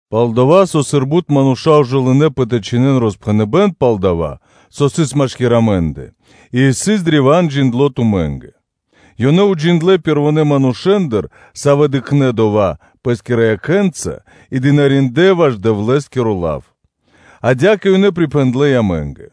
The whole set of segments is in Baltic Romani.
Пал-дова́ со, сыр бут мануша́ ужэ лынэпэ тэ чхинэн роспхэныбэн пал дова́, со сыс машки́р амэ́ндэ и, со исын древа́н джиндло́ тумэ́нгэ, ёнэ уджиндлэ́ манушэ́ндыр, савэ́ пэ́рва дыкхнэ́ дова́ пэ́скирэ якхэ́нца и служындлэ (дынариндлэ́) ваш Дэвлэ́скиро лав, адя́кэ ёнэ пирипхэндлэ амэ́нгэ.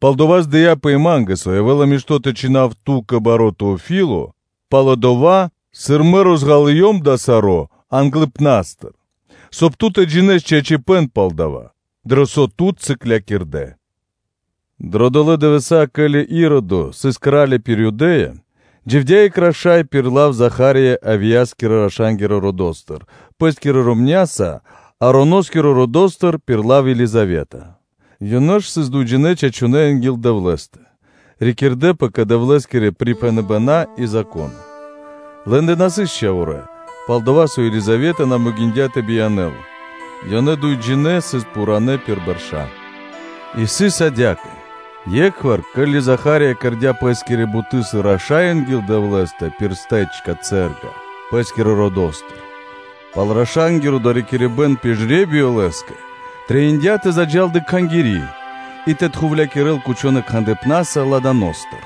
Палдава́ здыяпэ и ма́нгэ, со явэ́ла мишто́ тэ чхинав ту́кэ, баро́ Теофиле, пало́ дова́, сыр мэ лачхэ́с розґалыём дава́ саро́ англыпна́стыр, соб (кай) ту тэ джинэ́с чачипэ́н пал дова́, дро со тут сыклякирдэ́. Дро долэ́ дывэса́, ке́ли Иродо сыс кра́ли пир Юдэ́я, дживдя́ екх раша́й пир лав Заха́рия Авияскирэ раша́нгирэ родо́стыр, пэ́скирэ ромня́са, Ароноскирэ родо́стыр пир лав Елизавета. Ёнэ ж сыс дуйджинэ́ чачунэ́ анги́л Дэвлэ́стэ, рикирдэпэ кэ Дэвлэ́скирэ припхэныбэна́ и Зако́но. Лэ́ндэ на сыс чхаворэ́, пал-дова́ со Елизавета на могиндя́ тэ биянэ́л, ёнэ дуйджинэ́ сыс пхурэ́ пир бэрша́. И сыс адя́кэ: е́кхвар, ке́ли Заха́рия кэрдя́ пэ́скири буты́ сыр раша́й анги́л Дэвлэ́стэ, сыр сыс прилыно пэ́скирэ родо́стыр, пал раша́нгиро доракирибэ́н пир жре́биё лэ́скэ трэиндя́ тэ заджа́л дрэ Кхангири́ и тэ тхувлякирэл гудлэ́ смолэнца ладаностыр,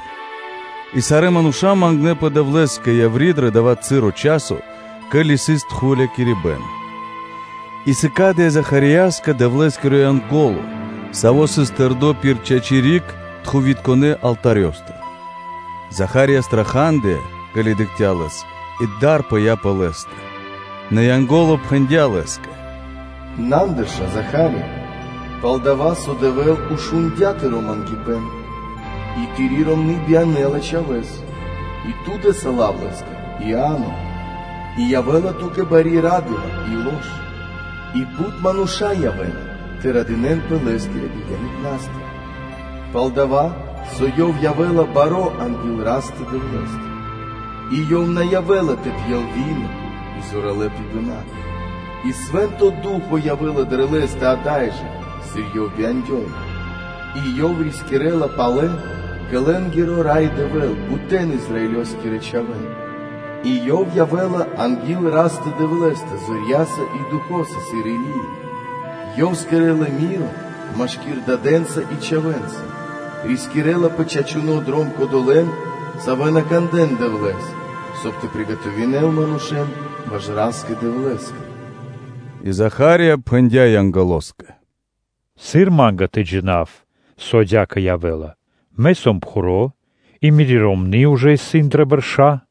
и сарэ́ мануша́ мангнэпэ Дэвлэ́скэ яври́ дро дава́ часо, ке́ли сыс тхувлякирибэн гудлэ́ смоласа. И сыкадыя́ Захарияскэ Дэвлэ́скиро Янго́ло, саво́ сыс тэрдо́ пир чачи́ (право) риг тхувитконэ (кадилытконэ) алтарёстыр. Заха́рия страхадыя, ке́ли дыкхця́ лэс, и дар пыя́ пэ лэ́стэ. Нэ Янго́ло пхэндя́ Лэ́скэ: “На андырша, Заха́рия, пал-дова́ со Дэвэ́л шундя́ тыро́ мангипэ́н, и тыри́ ромны́ биянэ́ла чхавэ́с, и ту дэ́са лав Лэ́скэ Иа́но. И явэ́ла ту́кэ бари ра́дыма и весёлыма (лош), и бут мануша́ явэ́на тэ радынэ́нпэ лэ́скирэ бияныпнастыр. Пал-дова́ со ёв явэ́ла баро́ анги́л Растэ-Дэвлэ́стэ, и ёв на явэ́ла тэ пьел мол (вино) и зоралэ́ пибэна, и Свэ́нто Ду́хо (Фа́но) явэ́ла дрэ лэ́стэ ада́й жэ, сыр ёв бияндёла, и ёв рискирэ́ла палэ кэ Лэ́нгиро Рай Дэвэ́л бутэн Израилёскирэ чхавэ́н. И ёв явэ́ла анги́л Растэ-Дэвлэ́стэ, зорья́са и духо́са сыр Или́я, и ёв кэрэ́ла рама́не (миро) машки́р дадэндэ и чхавэ́ндэ, рискирэ́ла пэ чачуно́ дром кодолэ́н, савэ́ на кандэ́на Дэвлэ́с, соб (кай) тэ скэдэл манушэ́н ваш Ра́скэ-Дэвлэ́скэ.” И Заха́рия пхэндя́ Янголоскэ: “Сыр ма́нгэ тэ джина́в, со адя́кэ явэ́ла? Мэ сом пхуро́, и мири́ ромны́ исын ужэ дрэ бэрша́.”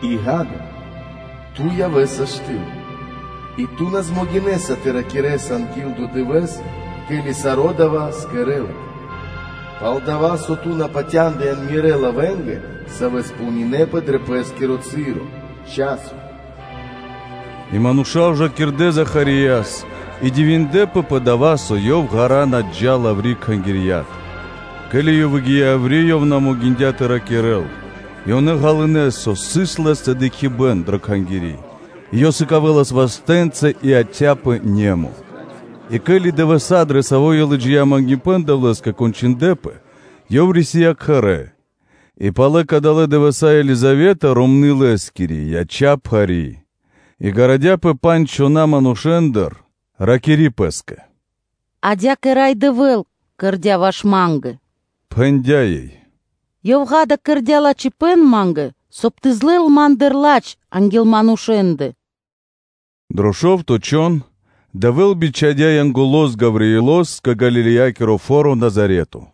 и, ґа́да, ту явэ́са штыл и ту на дэ́са ра́да (на змогинэса) тэ ракирэ́с анги́л дова́ дывэ́с, ке́ли саро́ дава́ кэрэ́лапэ, пал-дова́ со ту на патяндыян Мирэ́ лавэнгэ, савэ́ кэрэ́напэ кэ ко́нцо / яго́ро дро пэ́скиро часо. И мануша́ ужакирдэ Захарияс и дивиндлэ́пэ пэ дава́, со ёв ґара́ (длу́гэс) на джа́лас яври́ Кхангирья́тыр. Ке́ли ёв выгия́ яври́, ёв на дыя́ ра́да тэ ракирэ́л, и ёнэ ґалынэ́, со сыс лэ́стэ дыкхибэ́н дро Кхангири́; и ёв сыкавэлас вастэ́нца и ёв яця́пэ немо (муто). И ке́ли дывэса́ кончындлэпэ, дрэ савэ́ ёв лыджия́ мангипэ́н Дэвлэ́скэ, ёв рисия́ кхэрэ́. И пало́ кадалэ́ дывэса́ э Елизавета, ромны́ лэ́скири яця́ пхари́, и гарадяпэ пандж чхона́ манушэ́ндыр, ракири́ пэ́скэ: “Адя́кэ, Рай Дэвэ́л кэрдя́ ваш ма́нгэ”, – пхэндя́ ёй, – “Ёв, ґа́да, кэрдя́ лачхипэ́н ма́нгэ, соб (кай) Ёв тэ лэл криг ма́ндыр ладж анги́л манушэ́ндэ.” Дро шо́вто чхон Дэвэ́л бичхадя́ Янголо́с Гавриилос кэ Галилеякиро фо́ро Назарето.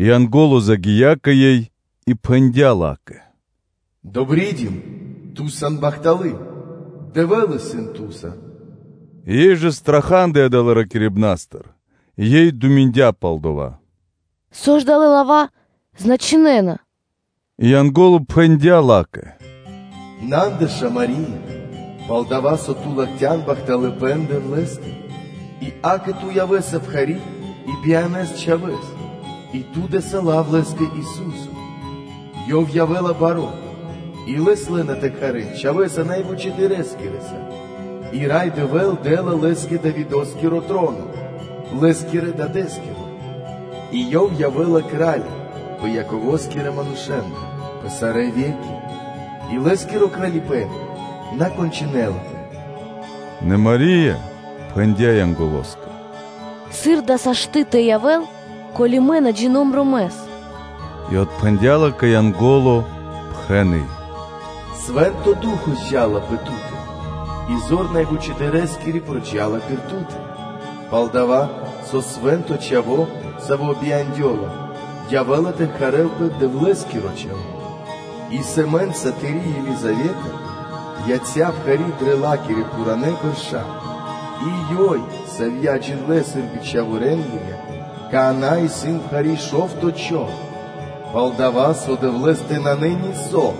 И Янго́ло загия́ кэ ёй, и пхэндя́ ла́кэ: “Добридим! Ту сан бахталы́ Дэвлэ́стыр! Дэвэ́л исын Ту́са!” Ёй жа страхадыя далэ́ ракирибнастыр, и Ёй дыя́ годы́ пэ́скэ (думиндя) пал дова́; “Со ж далэ́ лава́ значынэна?” И Янго́ло пхэндя́ ла́кэ: “На андырша, Мари́я, пал-дова́ со Ту латхян бахталыпэ́н Дэвлэ́стэ. И Ту явэ́са пхари́, и биянэса Чхавэ́с, и Ту дэ́са лав Лэ́скэ Ису́со. Ёв явэ́ла баро́, и Лэс лэ́на тэ кхарэ́н Чхавэ́са Най Вучэдырэскирэса, и Рай Дэвэ́л дэ́ла Лэ́скэ Давидо́скиро троно, Лэ́скирэ Дадэ́скиро; и Ёв явэ́ла кра́ли пэ Яково́скирэ манушэ́ндэ пэ сарэ́ ве́ки; и Лэ́скиро Кралипэ́н на кончынэлапэ.” Нэ Мари́я пхэндя́ Янголоскэ: “Сыр дава́ сашты́ (могинэ́ла) тэ явэ́л, ко́ли мэ на джина́в ромэс?” И отпхэндя́ ла́кэ Янго́ло, пхэны: “Свэ́нто Ду́хо (Фа́но) зджа́ла пэ Ту́тэ, и зор Сарэвучэдырэскири учхакирэ́ла Тут; пал-дова́ со Свэ́нто Чхаво́, Саво́ бияндёла, явэ́ла тэ кхарэлпэ Дэвлэ́скиро Чхаво́. И ишчо (инкэ́), сэмэ́нца Тыри́, Елизавета, яця́ пхари́ дрэ ла́кирэ пхурэ́ бэрша́; и ёй, савья́ джиндлэ́ сыр бичхаворэнгирья, какана́ исын пхари́ шо́вто чхон, пал-дова́ со Дэвлэ́стэ нанэ нисо́,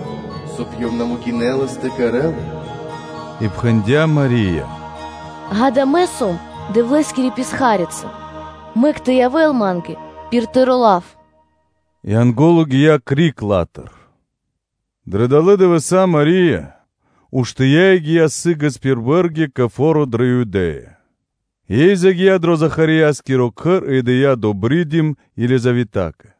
соб (кай) Ёв на дэ́лас бы ра́да (могинэлас) тэ кэрэ́л. И пхэндя́ Мари́я: “Ѓа́да, мэ сом Дэвлэ́скири писхарица; мэк тэ явэ́л Ма́нгэ пир Тыро́ лав.” И Янго́ло гия́ криг ла́тыр. Дрэ далэ́ дывэса́ Мари́я уштыя́ и гия́ сы́гэс пир бэргитко пхув кэ фо́ро дрэ Юдэ́я, и ёй загия́ дро Захарияскиро кхэр и дыя́ “добридим” Елизаветакэ.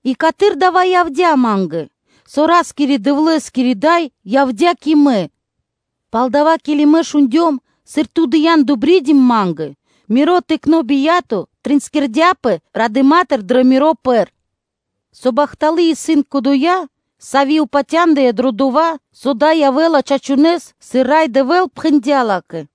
И каты́р дава́ явдя́ ма́нгэ, со Ра́скирэ-Дэвлэ́скири Дай явдя́ кэ Мэ? Пал-дова́, ке́ли мэ шундём, сыр Ту дыя́н “добридим” ма́нгэ, миро тыкно́ бия́то обрадындяпэ радыма́тыр дро миро пэр, со бахталы́ исын Кодоя, Сави́ упатяндыя дро дова́, со дава́ явэ́ла чачунэ́с, сыр Рай Дэвэ́л пхэндя́ ла́кэ.”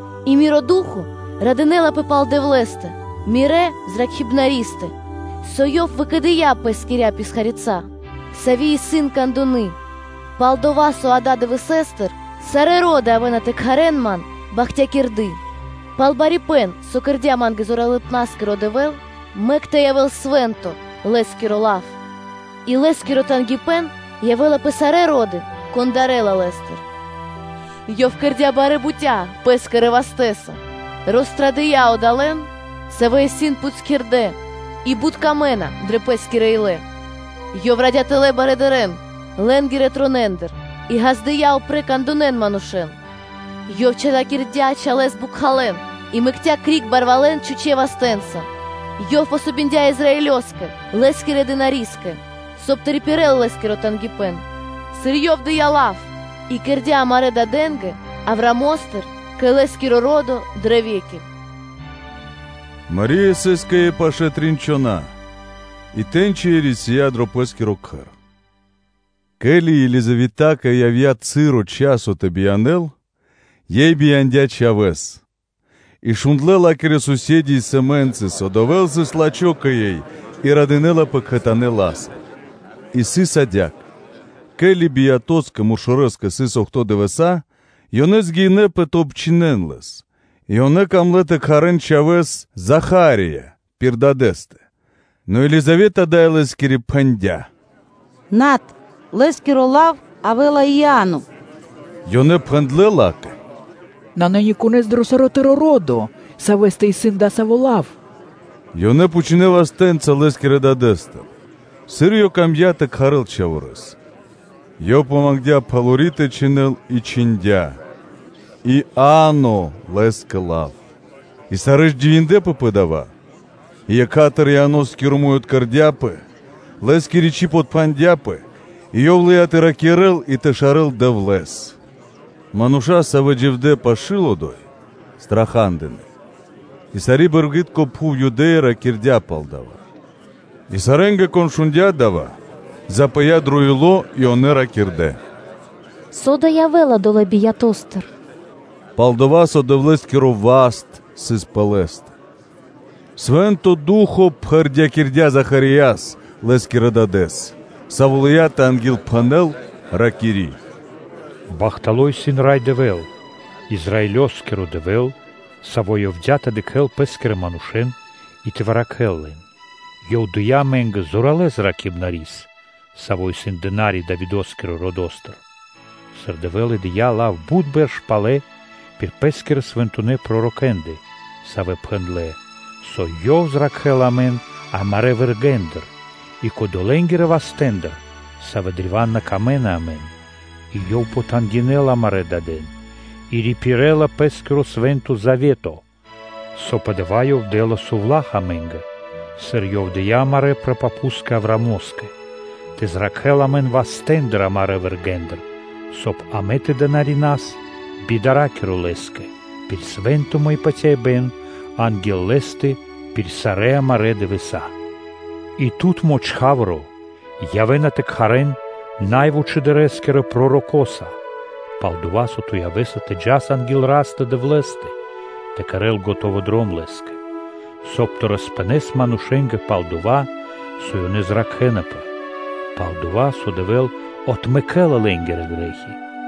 и Миро ду́хо (фа́но) радынэ́лапэ пал Дэвлэ́стэ, Мирэ́ Зракхибнаристэ. Со Ёв подыкхця́ ласкаса пэ Пэ́скирэ писхарицатэ, сави́ исын кандуны, пал-дова́ со далэ́ дывэсэ́стыр сарэ́ ро́ды явэ́на тэ кхарэ́н Ман “бахтякирды”; пал барипэ́н, саво́ со кэрдя́ Ма́нгэ Зоралыпнаскиро Дэвэ́л, мэк тэ явэ́л свэ́нто Лэ́скиро лав, И Лэ́скиро тангипэ́н явэ́ла пэ сарэ́ ро́ды, кон дарэ́ла Лэ́стыр. Ёв кэрдя́ барэ́ бутя́ Пэ́скирэ мышчаса (вастэ́са), рострадыя одолэ́н, савэ́ исын пхутькирдэ́ и бут камэ́на дрэ пэ́скирэ илэ; Ёв радя тэлэ́ зоралэн лэ́нгирэ тронэндыр и ґаздыя́ упрэ́ кандунэ манушэ́н; Ёв чалякирдя чалэ́с бокхалэн, и мэкця́ криг барвалэн чхучэ́ вастэ́нца, Ёв дыя́ васт (помогиндя) Израилёскэ, Лэ́скирэ дынари́скэ, соб (кай) тэ рипирэл Лэ́скиро тангипэ́н, сыр Ёв дыя́ лав и кэрдя́ амарэ́ дадэ́нгэ, Авраамостыр кэ Лэ́скиро ро́до дрэ ве́ки.” Мари́я сыс кэ ёй пашэ́ трин чхона́, и тэ́ньчи Ёй рисия́ дро Пэ́скиро Кхэр. Ке́ли Елизаветакэ явдя́ часо тэ биянэ́л, ёй бияндя́ чхавэ́с. И шундлэ́ ла́кирэ сусе́ды (кота́рья) и сэмэнцы, со Дэвэ́л сыс лачхо́ кэ ёй, и радындлэпэ кхэтанэ́ ла́са. И сыс адя́кэ: ке́ли биятоскэ (муршорэскэ) сыс охто́ (бидуе́нгиро дэш) дывэса́, ёнэ явнэ́ тэ обчхинэн лэс, и ёнэ камлэ́ тэ кхарэ́н чхавэ́с “Заха́рия” пир дадэ́стэ, нэ Елизавета, дай лэ́скири, пхэндя́: “Над, Лэ́скиро лав явэ́ла Иа́но.” Ёнэ пхэндлэ́ ла́кэ: “Нанэ никонэ́с дро саро́ тыро́ ро́до, савэ́стэ исын дасаво лав.” Ёнэ пхучнэ́ вастэ́нца лэ́скирэ дадэ́стыр, сыр ёв камдя́ тэ кхарэл чхаворэс. Ёв мангдя́ пхалори тэ чхинэл, и чхиндя́ “Иа́но” лэ́скэ лав и сарэ́ ж дивиндлэ́пэ пэ дава́. И екха́тыр Захарияскиро муй откэрдяпэ, лэ́скири чиб отпхандяпэ, и ёв лыя́ тэ ракирэ́л, и тэ шарэл Дэвлэ́с. Мануша́, савэ́ дживдэ́ пашы́л одо́й, страха́дынэ, и сари́ бэргитко пхув Юдэ́я ракирдя́ пал дава́. И сарэ́нгэ, кон шундя́ дава́, запыя дро ило́ и ёнэ ракирдэ́: “Со да явэ́ла долэ́ биятостыр?” Пал-дова́ со Дэвлэ́скиро васт сыс пэ лэ́стэ. Свэ́нто Ду́хо (Фа́но) пхэрдякирдя́ Захарияс, лэ́скирэ дадэ́с, Саво́ лыя́ тэ ангилпхэнэл, ракири́: “Бахтало́ исын Рай Дэвэ́л, Израилёскиро Дэвэ́л, Саво́ явдя́ тэ дыкхэ́л Пэ́скирэ манушэ́н и тэ выракхэл лэн, Ёв дыя́ амэ́нгэ зоралэ́ Зракхибнарис, саво́ исын Дына́ри Давидо́скирэ родо́стыр, Сыр Дэвэ́л и дыя́ лав бут бэрш палэ пир Пэ́скирэ Свэнтонэ́ пророкэ́ндэ, савэ́ пхэндлэ́, со Ёв зракхэ́ла амэн амарэ́ вэргэ́ндыр и кодолэнгирэ вастэ́ндыр, савэ́ древа́н на вырикирэна амэн, и Ёв потангинэла (пожалинэла) амарэ́ дадэн и рипирэла Пэ́скиро Свэ́нто Завето. Со пэ дава́ Ёв дэ́ла совла́х амэ́нгэ, сыр Ёв дыя́ амарэ́ прапапускэ Авраамо́скэ, тэ зракхэ́л амэн вастэ́ндыр амарэ́ вэргэ́ндыр, соб (кай) амэ тэ дынарина́с би дара́киро Лэ́скэ, пир свэнтыма и патяибэ́н анги́л Лэ́стэ пир сарэ́ амарэ́ дывэса́. И тут, чхаворо́, явэ́на тэ кхарэ́н пророкоса Най Вучэдырэскирэса, пал-дова́ со ту явэ́са тэ джас анги́л Растэ-Дэвлэ́стэ тэ скэдэс дром Лэ́скэ, соб (кай) тэ роспхэнэс манушэ́нгэ пал дова́, со ёнэ зракхэнапэ, пал-дава́ со Дэвэ́л отмэкэ́ла лэ́нгирэ грэ́хи,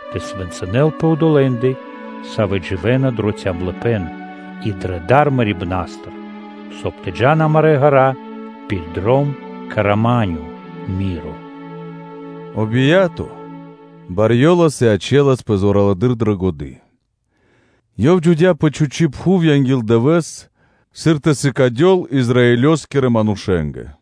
тэ свэнцынэл пэ одолэ́ндэ, савэ́ дживэ́на дро калыпэ́н (цямлыпэ́н) и дрэ дар мэрибна́стыр, соб (кай) тэ джа́н амарэ́ ґэра́ пир дром кэ рама́нё (миро).” О бия́то барьёлас и ячэласпэ зоралэды́р дро ду́хо (фа́но); ёв дживдя́ пэ чхучи́ пхув анги́л дывэ́с, сыр тэ сыкадел Израилёскирэ манушэ́нгэ.